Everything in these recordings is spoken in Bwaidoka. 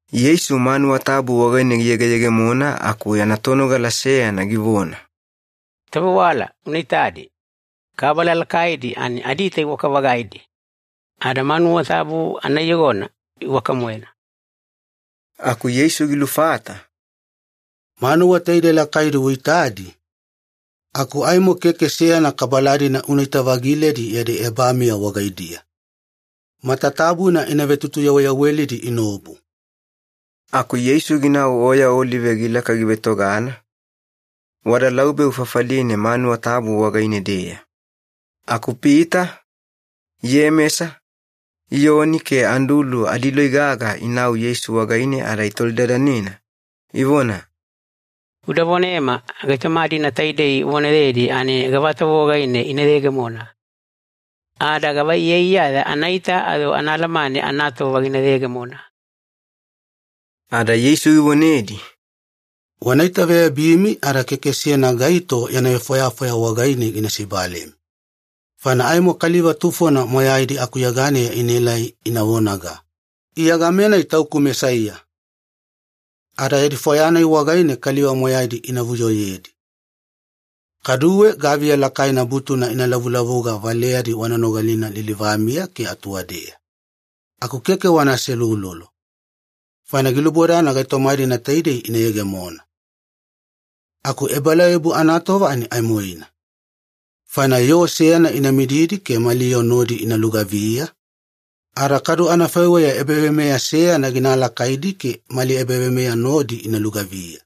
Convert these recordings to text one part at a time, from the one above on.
Yeisu manuwa tabu wagaine giyegeyegemona aku yana tonogala seyana givona, “Tovewala, una itadi. Kabala lakaidi ani adiita iwaka-vagaidi! Ada manuwa tabu anaiyogona iwaka-moena!” Aku Yeisu gilufata, “Manuwa taidei lakaidi uitadi, aku aimo keke seyana kabala-dina unaita-vagiledi yadi ebamiya wagaidiya. Matatabuna ina vetutuyaweyawelidi inaobu.” Aku Yeisu ginau Oya Olive gilaka givetogana, wada laubeu fafaline manuwa tabu wagaine-deya. Aku Pita, Iyemesa, Iyoni ke Andulu adiloi gaga inau Yeisu wagaine ada itolidadanena, ivona, “Uda vonema, gaitoma-dina taidei uvonayedi ani gavatova wagaine ina yegemona? Ada gava iyaiyaya anaita ayo ana alamane anatova gina yegemona?” Ada Yeisu givonedi, “Wana itaveyabimi ada keke seyana gaito yana vefwayafwaya wagaine gina sibalemi. Faina aimo kaliva tufona moyaidi akuyeganeya inaelai ina vonaga, ‘Iya game-nai tauku Mesaiya!’ Ada yadi fwaya-nai wagaine kaliva moyaidi ina vuyoyedi. Kaduwe gaviya lakaidi butuna ina lavulavuga valeyadi wana nogalina lilivamiya ke atuwadeya. Aku keke wana aseuloulolo, faina gilubodana gaitoma-dina taidei ina yegemona. Aku ebalauyabu anatova ani aimoina. Faina yoo seyana ina mididi ke mali yoo nodi ina lugaviya, ada kadu anafaiweya ebaveimeya seyana gina alakaidi ke mali ebaveimeya nodi ina lugaviya.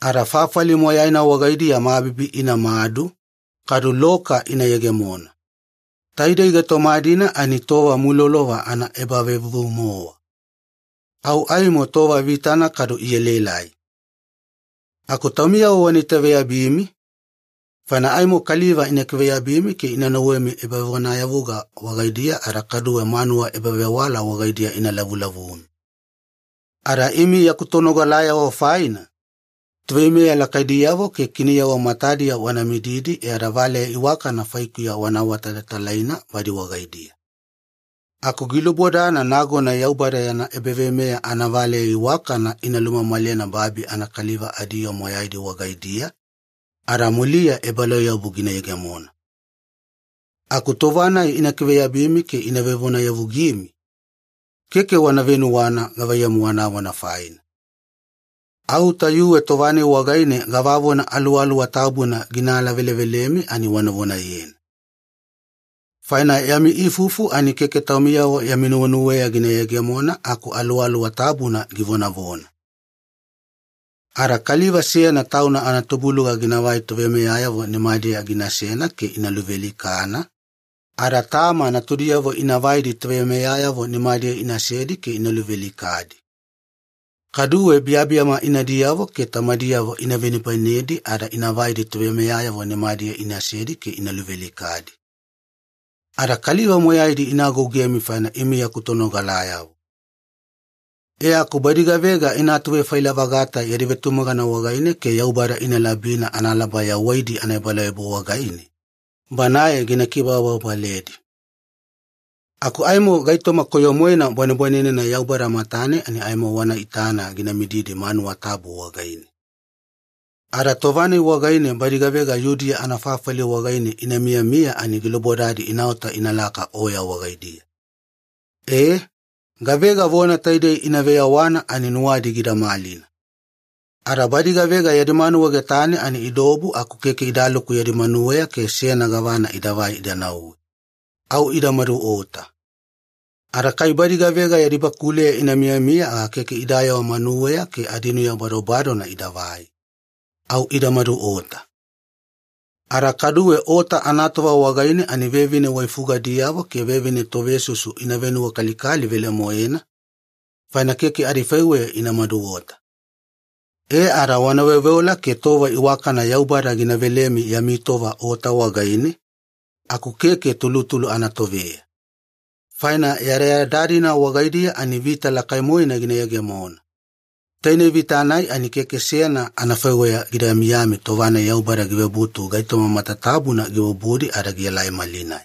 Ada fafali moyaina wagaidiya mabibi inamadu, kadu loka ina yegemona. Taidei gaitoma-dina ani tova mulolova anaebavevuvu-mowa. Au aimo tova vitana kadu ielaelai. “Aku taumiyavo wana itaveyabimi, faina aimo kaliva ina kiveyabimi ke ina nauwemi ebavonayavuga wagaidiya ada kaduwe manuwa ebavewala wagaidiya ina lavulavumi. Ada imi yaku tonogalayavo faina, toveimeya lakaidiyavo ke kiniyavo matadiya wana mididi e ada valeya iwakana faikuya wana awatalatalaina badi wagaidiya. Aku gilubodana nagona Yaubada yana ebaveimeya anavaleya iwakana ina lumamalena babi anakaliva adiyoo moyaidi wagaidiya, ada muliya ebalauyabu gina yegemona. Aku tova-nai ina kiveyabimi ke ina vevonayavugimi, keke wana venuwana gavaiyamu wanavona faina. Au tayuwe tova-nai wagaine gavavona Aluwaluwa Tabuna gina alavelevelemi ani wana vonayena. Faina yami ifufu ani keke taumiyavo yami nuwenuweya gina yegemona aku Aluwaluwa Tabuna givonavona. “Ada kaliva seyana tauna anatubuluga ginavai toveimeyayavo nimadiya ginasena ke ina luvealikana, ada tama natudiyavo ina vaidi toveimeyayavo nimadiya inasedi ke ina luvealikadi. Kaduwe biyabiyama inadiyavo ke tamadiyavo ina venibainedi ada ina vaidi toveimeyayavo nimadiya inasedi ke ina luvealikadi. Ada kaliva moyaidi ina agougemi faina imi yaku tonogalayavo. E aku badi gavega ina atuvefaila-vagata yadi vetumagana wagaine ke Yaubada ina labina analaba yawaidi anaebalauyabu wagaine, Banae gina kibababaledi. “Aku aimo gaitoma koyo-moena bwanebwanenena Yaubada matane ani aimo wana itana gina midimididi manuwa tabu wagaine. Ada tova-nai wagaine badi gavega Yudiya anafafali wagaine ina miyamiya ani gilubodadi inaota inalaka oya wagaidiya. Ee, gavega vona taidei ina veyawana ani nuwadi gida malina. Ada badi gavega yadi manuwa getane ani idaobu aku keke idaluku yadi manuweya ke seyana gavana idavai ida nauwe. Au ida maduota. Ada kai badi gavega yadi bakuleya ina miyamiya aga keke idayewa manuweya ke adinuya badobadona idavai. Au ida maduota. Ada kaduwe ota anatova wagaine ani vevine waifugadiyavo ke vevine tovesusu ina venuwakalikali velemoena, faina keke adifaiweya ina maduota. E ada wana veoveola ke tova iwakana Yaubada gina velemi yami tova ota wagaine, aku keke tulutulu anatoveya. Faina yadayada-dina wagaidiya ani vita lakai-moena gina yegemona. Tainei vita-nai ani keke seyana anafaiweya gida miyami tova-nai Yaubada givebutu gaitoma matatabuna gibubudi ada gielai malinai.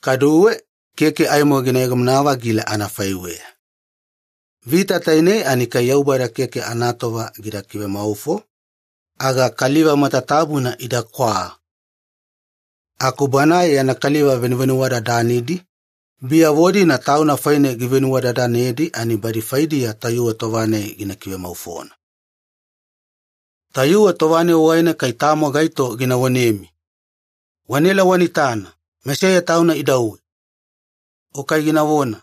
Kaduwe, keke aimo gina yegemona-vagila anafaiweya. Vita tainei ani kai Yaubada keke anatova gida kivemaufo, aga kaliva matatabuna idakwa. Aku Banae yana kaliva venuvenuwadadanidi, biyavo-dina Tauna faine givenuwadadanedi ani badi faidiya tayuwe tova-nai gina kivemaufona. “Tayuwe tova-nai wagaine kai tamo gaito gina vonemi, ‘Wanaela wana itana, Mesaiya Tauna idauwe!’ o kai ginavona,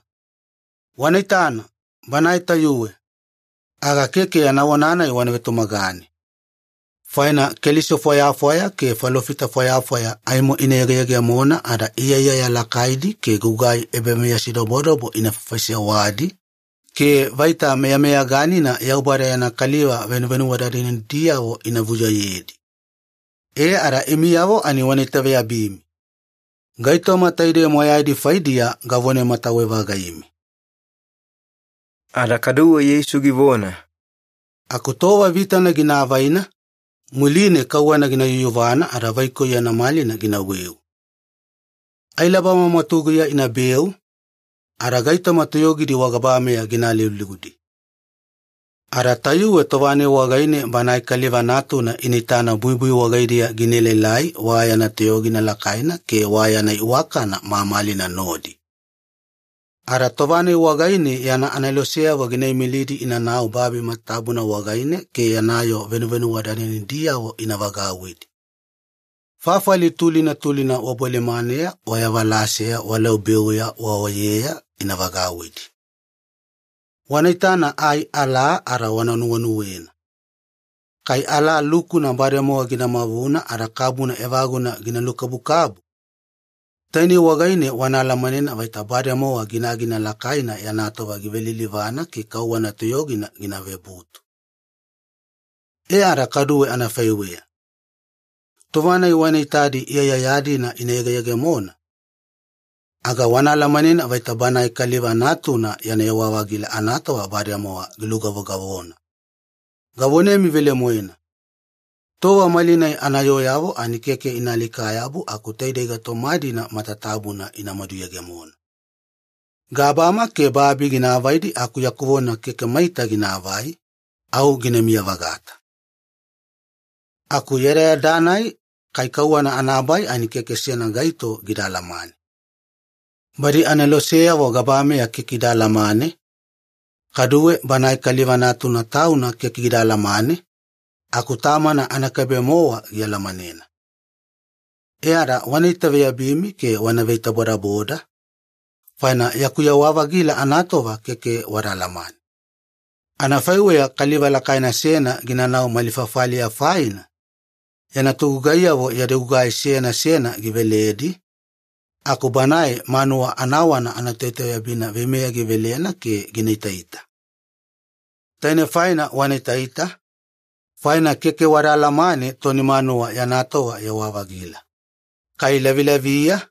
‘Wana itana, Banae tayuwe!’ aga keke yana vona-nai wana vetumagane. Faina keliso fwayafwaya ke falofita fwayafwaya aimo ina yegeyegemona ada iyaiyaya lakaidi ke gugai ebameyasidobodobo ina faifaisewadi, ke vaita meyameyaganina Yaubada yana kaliva venuvenuwadadanidiyavo ina vuyoyedi. E ada imiyavo ani wana itaveyabimi! Gaitoma taidei moyaidi faidiya gavonamatawe-vagaimi.” Ada kaduwe Yeisu givona, “Aku tova vitana gina avaina, muline kauwana gina yuyuvana ada vaikoi yana malina ginaweu. Ailabama mwatuguya inabeu, ada gaitoma toyogidi wagabameya gina aliuliudi. Ada tayuwe tova-nai wagaine Banae Kaliva Natuna ina itana buibui wagaidiya gina elaelai wa yana toyogina lakaina ke wa yana iwakana mamalina nodi. Ada tova-nai wagaine yana aneloseyavo gina imilidi inanau babi matatabuna wagaine ke yana yoo venuvenuwadadanidiyavo ina vagauwidi. Fafali tulina tulina wabolimaneya wayavalaseya walaubeuya waoyeya ina vagauwidi. “Wana itana ai alaa ada wana nuwenuwena. Kai alaa lukuna bademowa gina mavuna ada kabuna evaguna gina lukabukabu, tainei wagaine wana alamanena vaita bademowa ginagina lakaina yana tova givelilivana ke kauwana toyogina gina vebutu. E ada kaduwe anafaiweya, tova-nai wana itadi iyaiyaya-dina ina yegeyegemona, aga wana alamanena vaita Banae Kaliva Natuna yana yewa-vagila anatova bademowa gilugavogavona. Gavonemi velemoena, tova malinai anayooyavo ani keke ina alika-yabu aku taidei gaitoma-dina matatabuna inamadu yegemona. Gabama ke babi gina avaidi aku yaku vona keke maita ginaavai, au ginamiya-vagata. “Aku yadayada-nai kai kauwana anabai ani keke seyana gaito gida alamane. Badi aneloseyavo gabameya keke ida alamane, kaduwe Banae Kaliva Natuna Tauna keke gida alamane, aku Tamana anakaibe-mowa gialamanena. E ada wana itaveyabimi ke wana veitabodaboda, faina yaku yewa-vagila anatova keke wada alamane. Anafaiweya kaliva lakaina seyana ginanau mali fafaliya faina, yana togugaiyavo yadi gugai seyana seyana giveledi, aku banae manuwa anawana anatoitaveyabina veimeya givelena ke gina itaita. Tainei faina wana itaita, faina keke wada alamane toni manuwa yana tova yewa-vagila, kai lavilaviya,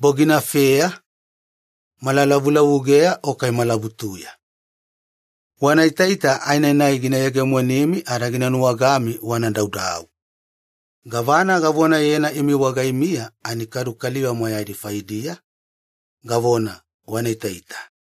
boginafeya, malalavulavugeya o kai malabutuya. Wana itaita aenanai gina yegemonimi ada gina nuwagami wana daudau. Gavana gavonayena imi wagaimiya ani kadu kaliva moyaidi faidiya, gavona, ‘Wana itaita.’”